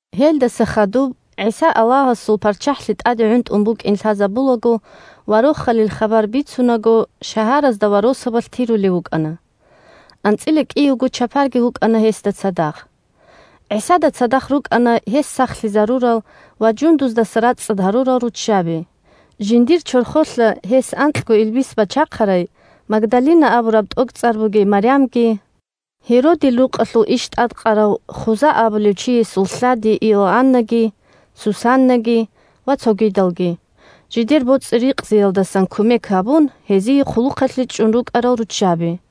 Гьелдаса хадуб ГӀиса Аллагьасул ПарччахӀлъи тӀаде гӀунтӀун букӀин лъазабулаго ва Рохалил хабар бицунаго шагьаразда ва росабалъ тирулев вукӀана. АнцӀила кӀиявго чапарги вукӀана гьесда цадахъ. ГӀисада цадахъ рукӀана гьес сахлъизарурал ва жундуздаса рацӀцӀад гьарурал руччаби: жиндир чорхолъа гьес анкьго илбис бачахъарай Магдалина абураб тӀокӀцӀар бугей Марямги, Гьеродил рукъалъул иш тӀадкъарав Хуза абулев чиясул лъади Иоаннаги, Сусаннаги ва цогидалги, жидер боцӀи-рикъзиялдасан кумек гьабун, гьезие хъулухъалъе чӀун рукӀарал руччаби.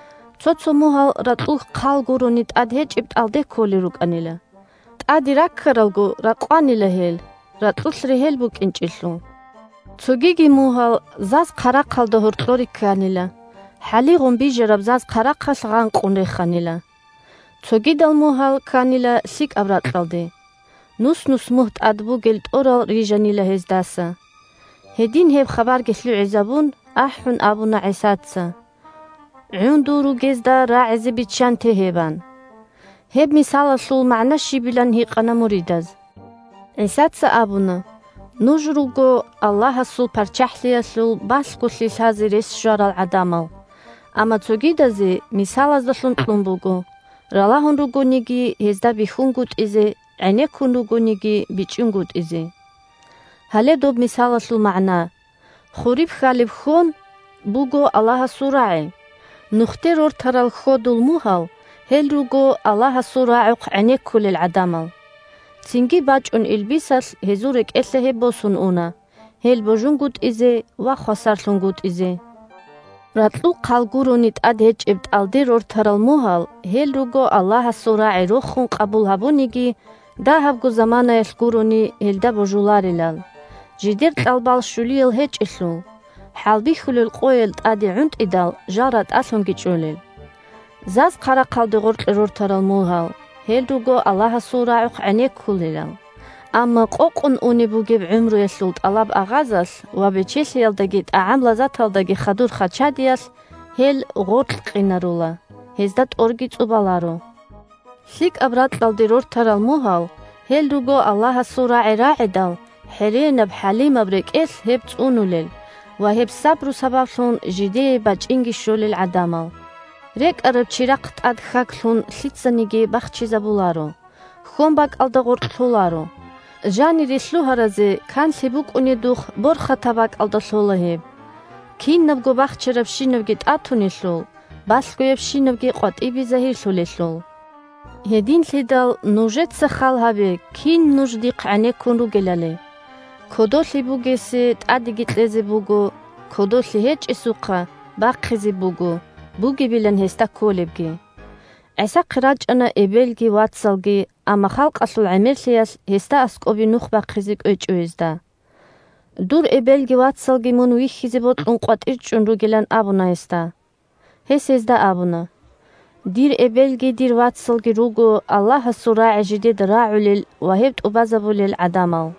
Цо-цо мугьал ракьул хъал гурони тӀад гьечӀеб тӀалде кколел рукӀанила. ТӀаде раккаралго ракъванила гьел, ракьулъ регьел букӀинчӀелъул. Цогиги мугьал заз-хъарахъалда гьоркьоре кканила, хӀалигъун бижараб заз-хъарахъалъ гъанкъун реханила. Цогидал мугьал кканила лъикӀаб ракьалде. Нус-нус мугь тӀад бугел тӀорал рижанила гьездаса. Гьедин гьеб хабарги лъугӀизабун, ахӀун абуна ГӀисаца: – ГӀундул ругезда рагӀизе биччанте гьеб! – ан. Гьеб мисалалъул магӀна щибилан гьикъана муридаз. ГӀисаца абуна: – Нуж руго Аллагьасул ПарччахӀлъиялъул балъголъи лъазе рес щварал гӀадамал, амма цогидазе – мисалаздалъун кьун буго, ралагьун ругониги гьезда бихьунгутӀизе, гӀенеккун ругониги бичӀчӀунгутӀизе. Гьале доб мисалалъул магӀна: хуриб хьалеб хьон буго Аллагьасул рагӀи. Нухде рортарал хьодул мугьал – гьел руго Аллагьасул рагӀухъ гӀенеккулел гӀадамал, цинги бачӀун илбисалъ гьезул рекӀелъа гьеб босун уна, гьел божунгутӀизе ва хвасарлъунгутӀизе. Ракьул хъал гурони тӀад гьечӀеб тӀалде рортарал мугьал – гьел руго Аллагьасул рагӀи рохун къабул гьабуниги, дагьабго заманаялъ гурони гьелда божуларелал, – жидер кьалбал щулиял гьечӀелъул, хӀалбихьулел къоял тӀаде гӀунтӀидал, жал ратӀалъунги чӀолел. Заз-хъарахъалде гъорлъе рортарал мугьал – гьел руго Аллагьасул рагӀухъ гӀенеккулелал, – амма къокъун унеб бугеб гӀумруялъул тӀалаб-агъазалъ ва бечелъиялдаги тӀагӀам-лазаталдаги хадур хачадиялъ гьел гъоркькъинарула, гьезда тӀорги цӀубаларо. ЛъикӀаб ракьалде рортарал мугьал – гьел руго Аллагьасул рагӀи рагӀидал, хӀеренаб-хӀалимаб рекӀелъ гьеб цӀунулел ва гьеб сабру сабаблъун жидее бачӀинги щолел гӀадамал. РекӀараб чирахъ тӀад хьаг лъун лъицаниги бахчизабуларо, хьонбакӀалда гъоркь лъоларо. Жанире лъугьаразе канлъи букӀунедухъ борхатаб бакӀалда лъола гьеб. Кинабго бахчарабщинабги тӀатунелъул, балъгоябщинабги къватӀибе загьирлъулелъул. Гьединлъидал нужеца хал гьабе кин нуж дихъ гӀенеккун ругелали. Кодолъи бугесе тӀадеги кьезе буго, кодолъи гьечӀесухъа бахъизе буго бугебилан гьесда кколебги. ГӀисахъе рачӀана эбелги вацалги, амма халкъалъул гӀемерлъиялъ гьесда аскӀобе нух бахъизе кӀвечӀо гьезда. Дур эбелги вацалги мун вихьизе бокьун къватӀир чӀун ругилан абуна гьесда. Гьес гьезда абуна: – Дир эбелги дир вацалги руго Аллагьасул рагӀи жидеда рагӀулел ва гьеб тӀубазабулел гӀадамал.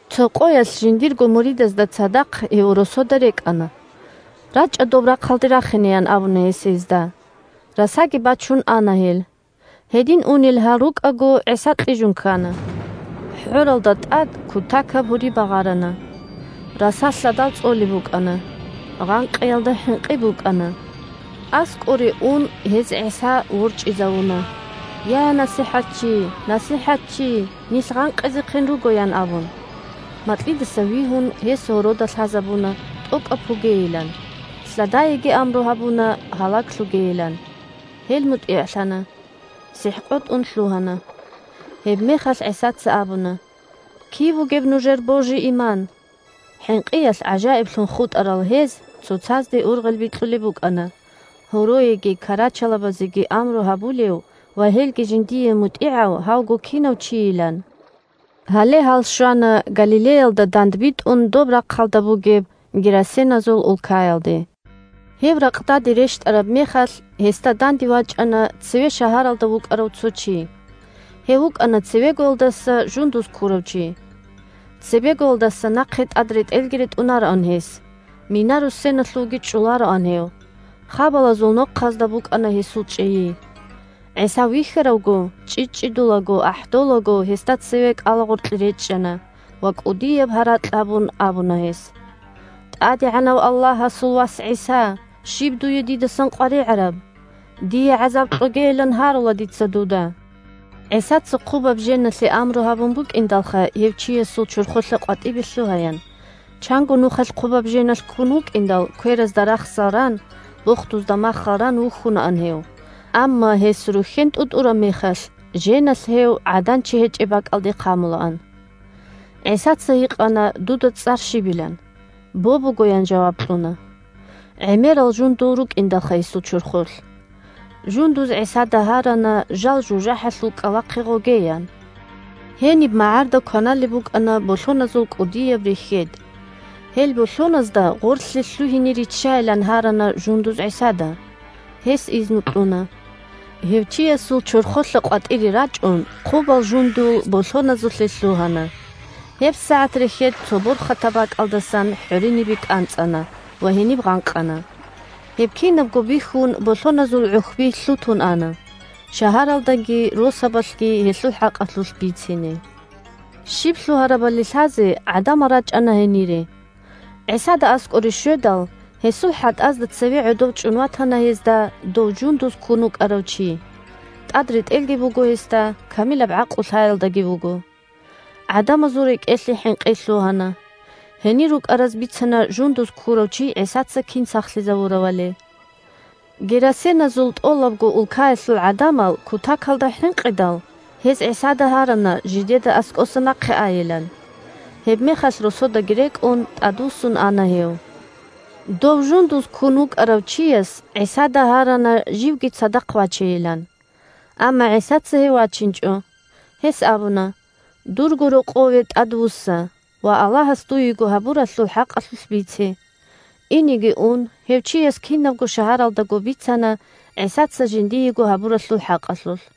Цо къоялъ жиндирго муридазда цадахъ гьев росода рекӀана. – РачӀа доб рахъалде рахине, – ян абуна гьес гьезда. Расаги бачун ана гьел. Гьедин унел гьал рукӀаго, ГӀиса кьижун ккана. ХӀоралда тӀад кутакаб гьури багъарана. Раса лъадал цӀолеб букӀана. Гъанкъиялда хӀинкъи букӀана. АскӀоре ун, гьез ГӀиса ворчӀизавуна: – Я, НасихӀатчи! НасихӀатчи! Нилъ гъанкъизехъин руго! – ян абун. Макьидаса вигьун, гьес гьорода лъазабуна тӀокӀаб пугейилан, лъадаеги амру гьабуна гьалаглъугейилан. Гьел мутӀигӀлъана. СихӀ къотӀун лъугьана. Гьебмехалъ ГӀисаца абуна: – Киб бугеб нужер божи-иман? ХӀинкъиялъ гӀажаиблъун хутӀарал гьез цоцазде ургъел бикьулеб букӀана, гьороеги карачалабазеги амру гьабулев ва гьелги жиндие мутӀигӀав гьавго кинав чийилан. Гьале гьал щвана Галилеялда дандбитӀун доб рахъалда бугеб герасеназул улкаялде. Гьев ракъдаде рещтӀараб мехалъ, гьесда данде вачӀана цеве шагьаралда вукӀарав цо чи. Гьев вукӀана цевегоялдаса жундуз ккурав чи. Цебегоялдаса нахъе тӀад ретӀелги ретӀунароан гьес, мина-руссеналъувги чӀолароан гьев, хабалазул нохъазда букӀана гьесул чӀейи. ГӀиса вихьаравго чӀчӀичӀчӀидулаго-ахӀдолаго гьесда цеве кӀалагъоркье речӀчӀана, ва кӀудияб гьаракь гьабун, абуна гьес: – ТӀадегӀанав Аллагьасул Вас ГӀиса, щиб дуе дидасан къваригӀараб? Дие гӀазаб кьогейилан гьарула дица дуда! (ГӀисаца хъубаб женалъе амру гьабун букӀиндалха гьев чиясул чорхолъа къватӀибе лъугьаян. Чанго нухалъ хъубаб женалъ ккун вукӀиндал, кверазда рахсал ран, бохдузда маххал ран вухьунаан гьев. Амма, гьес рухьен тӀутӀураб мехалъ, женалъ гьев гӀадан-чи гьечӀеб бакӀалде хъамулаан.) ГӀисаца гьикъана дуда цӀар щибилан. – «Бо» буго, – ян жаваб кьуна. ГӀемерал жундул рукӀиндалха гьесул чорхолъ. Жундуз ГӀисада гьарана жал жужахӀалъул кӀкӀалахъе гъогеян. Гьениб магӀарда кваналеб букӀана болъоназул кӀудияб рехьед. Гьел болъоназда гъорлъе лъугьине риччайин гьарана жундуз ГӀисада. Гьес изну кьуна. Гьев чиясул чорхолъа къватӀире рачӀун хъубал жундул болъоназулъе лъугьана. ГьебсагӀат рехьед цо борхатаб бакӀалдасан хӀоринибе кӀанцӀана ва гьениб гъанкъана. Гьеб кинабго бихьун болъоназул гӀухьби лъутун ана, шагьаралдаги росабалъги гьелъул хӀакъалъулъ бицине. Щиб лъугьарабали лъазе гӀадамал рачӀана гьенире. ГӀисада аскӀоре щведал, гьесул хӀатӀазда цеве гӀодов чӀун ватана гьезда дов жундуз ккун вукӀарав чи: тӀад ретӀелги буго гьесда, камилаб гӀакълу-лъаялдаги вуго. ГӀадамазул рекӀелъе хӀинкъи лъугьана. Гьенир рукӀараз бицана жундуз ккурав чи ГӀисаца кин сахлъизавуравали. Герасеназул тӀолабго улкаялъул гӀадамал кутакалда хӀинкъидал, гьез ГӀисада гьарана жидеда аскӀоса нахъе айилан. Гьебмехалъ, росодаги рекӀун, тӀадвуссун ана гьев. Дов жундуз ккун вукӀарав чияс ГӀисада гьарана живги цадахъ вачейилан. Амма ГӀисаца гьев вачинчӀо. Гьес абуна: – Дурго рокъове тӀадвусса ва Аллагьас дуего гьабуралъул хӀакъалъулъ бице. Инеги ун гьев чияс кинабго шагьаралдаго бицана ГӀисаца жиндиего гьабуралъул хӀакъалъулъ.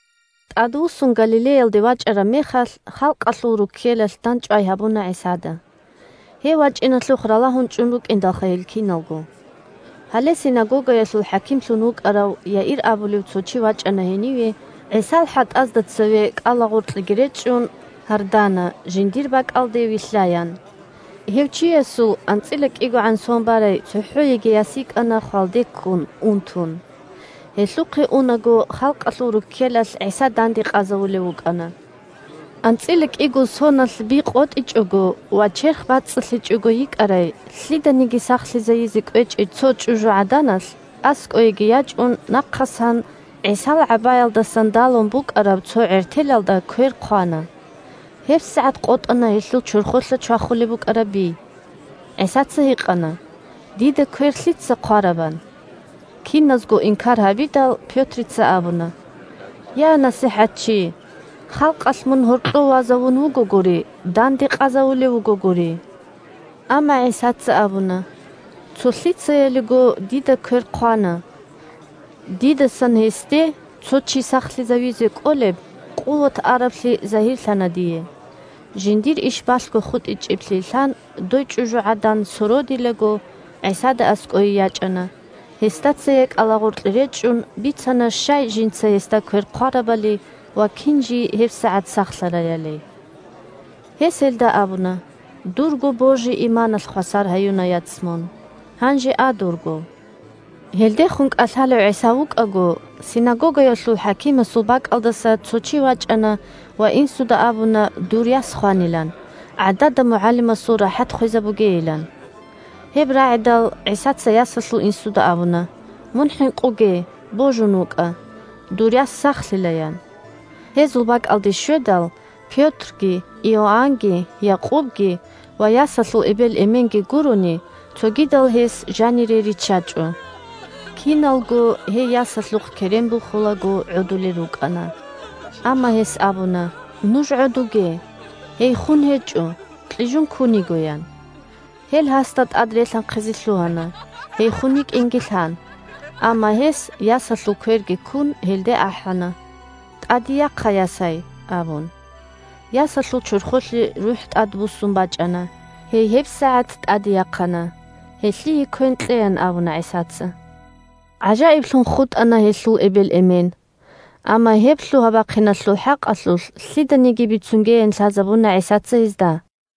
ТӀадвуссун Галилеялде вачӀараб мехалъ, халкъалъул руккелалъ дандчӀвай гьабуна ГӀисада. Гьев вачӀиналъухъ ралагьун чӀун рукӀиндалха гьел киналго. Гьале синагогаялъул хӀакимлъун вукӀарав Яир абулев цо чи вачӀана гьениве, ГӀисал хӀатӀазда цеве кӀалагъоркьеги речӀчӀун гьардана жиндир бакӀалде вилълъаян. Гьев чиясул анцӀила кӀигогӀан сон барай цохӀо йигей яс йикӀана хвалде ккун унтун. Гьелъухъе унаго халкъалъул руккелалъ ГӀиса данде къазавулев вукӀана. АнцӀила кӀиго соналъ би къотӀичӀого ва черх бацӀцӀалъичӀого йикӀарай, лъиданиги сахлъизайизе кӀвечӀей цо чӀужугӀаданалъ, аскӀоеги ячӀун, нахъасан ГӀисал гӀабаялдасан далун букӀараб цо гӀертелалда квер хъвана. ГьебсагӀат къотӀана гьелъул чорхолъа чвахулеб букӀараб би. ГӀисаца гьикъана: – Дида квер лъица хъвараб? – ан. Киназго инкар гьабидал, Пётрица абуна: – Я, НасихӀатчи, халкъалъ мун гьоркьов вазавун вугогури, данде къазавулев вугогури. Амма ГӀисаца абуна: – Цо лъицаялиго дида квер хъвана. Дидасан гьесде цо чи сахлъизавизе кӀолеб къуват араблъи загьирлъана дие. Жиндир иш балъго хутӀичӀеблъи лъан, дой чӀужугӀадан сородилаго ГӀисада аскӀое ячӀана, гьесда цее кӀалагъоркье речӀчӀун, бицана щай жинца гьесда квер хъварабали ва кин жий гьебсагӀат сахлъараялиги. Гьес гьелда абуна: – Дурго божи-иманалъ хвасар гьаюна, яц, мун. Гьанже а дурго! Гьелдехун кӀалъалев ГӀиса вукӀаго, синагогаялъул хӀакимасул бакӀалдаса цо чи вачӀана ва инсуда абуна дур яс хванилан, гӀадада МугӀалимасул рахӀат хвезабугейилан. Гьеб рагӀидал, ГӀисаца ясалъул инсуда абуна: – Мун хӀинкъуге, божун вукӀа. Дур яс сахлъила, – ян. Гьезул бакӀалде щведал, Пётрги, Иоаннги, Якъубги ва ясалъул эбел-эменги гурони, цогидал гьес жанире риччачӀо. Киналго, гьей ясалъухъ керен бухулаго, гӀодулел рукӀана. Амма гьес абуна: – Нуж гӀодуге. Гьей хун гьечӀо, кьижун ккун йиго, – ян. Гьел гьасда тӀад релъанхъизе лъугьана, гьей хун йикӀинги лъан. Амма гьес, ясалъул кверги ккун, гьелде ахӀана: – ТӀаде яхъа, ясай! – абун. Ясалъул чорхолъе рухӀ тӀадбуссун бачӀана, гьей гьебсагӀат тӀаде яхъана. Гьелъие квен кьеян абуна ГӀисаца. ГӀажаиблъун хутӀана гьелъул эбел-эмен. Амма гьеб лъугьа-бахъиналъул хӀакъалъулъ лъиданиги бицунгеян лъазабуна ГӀисаца гьезда.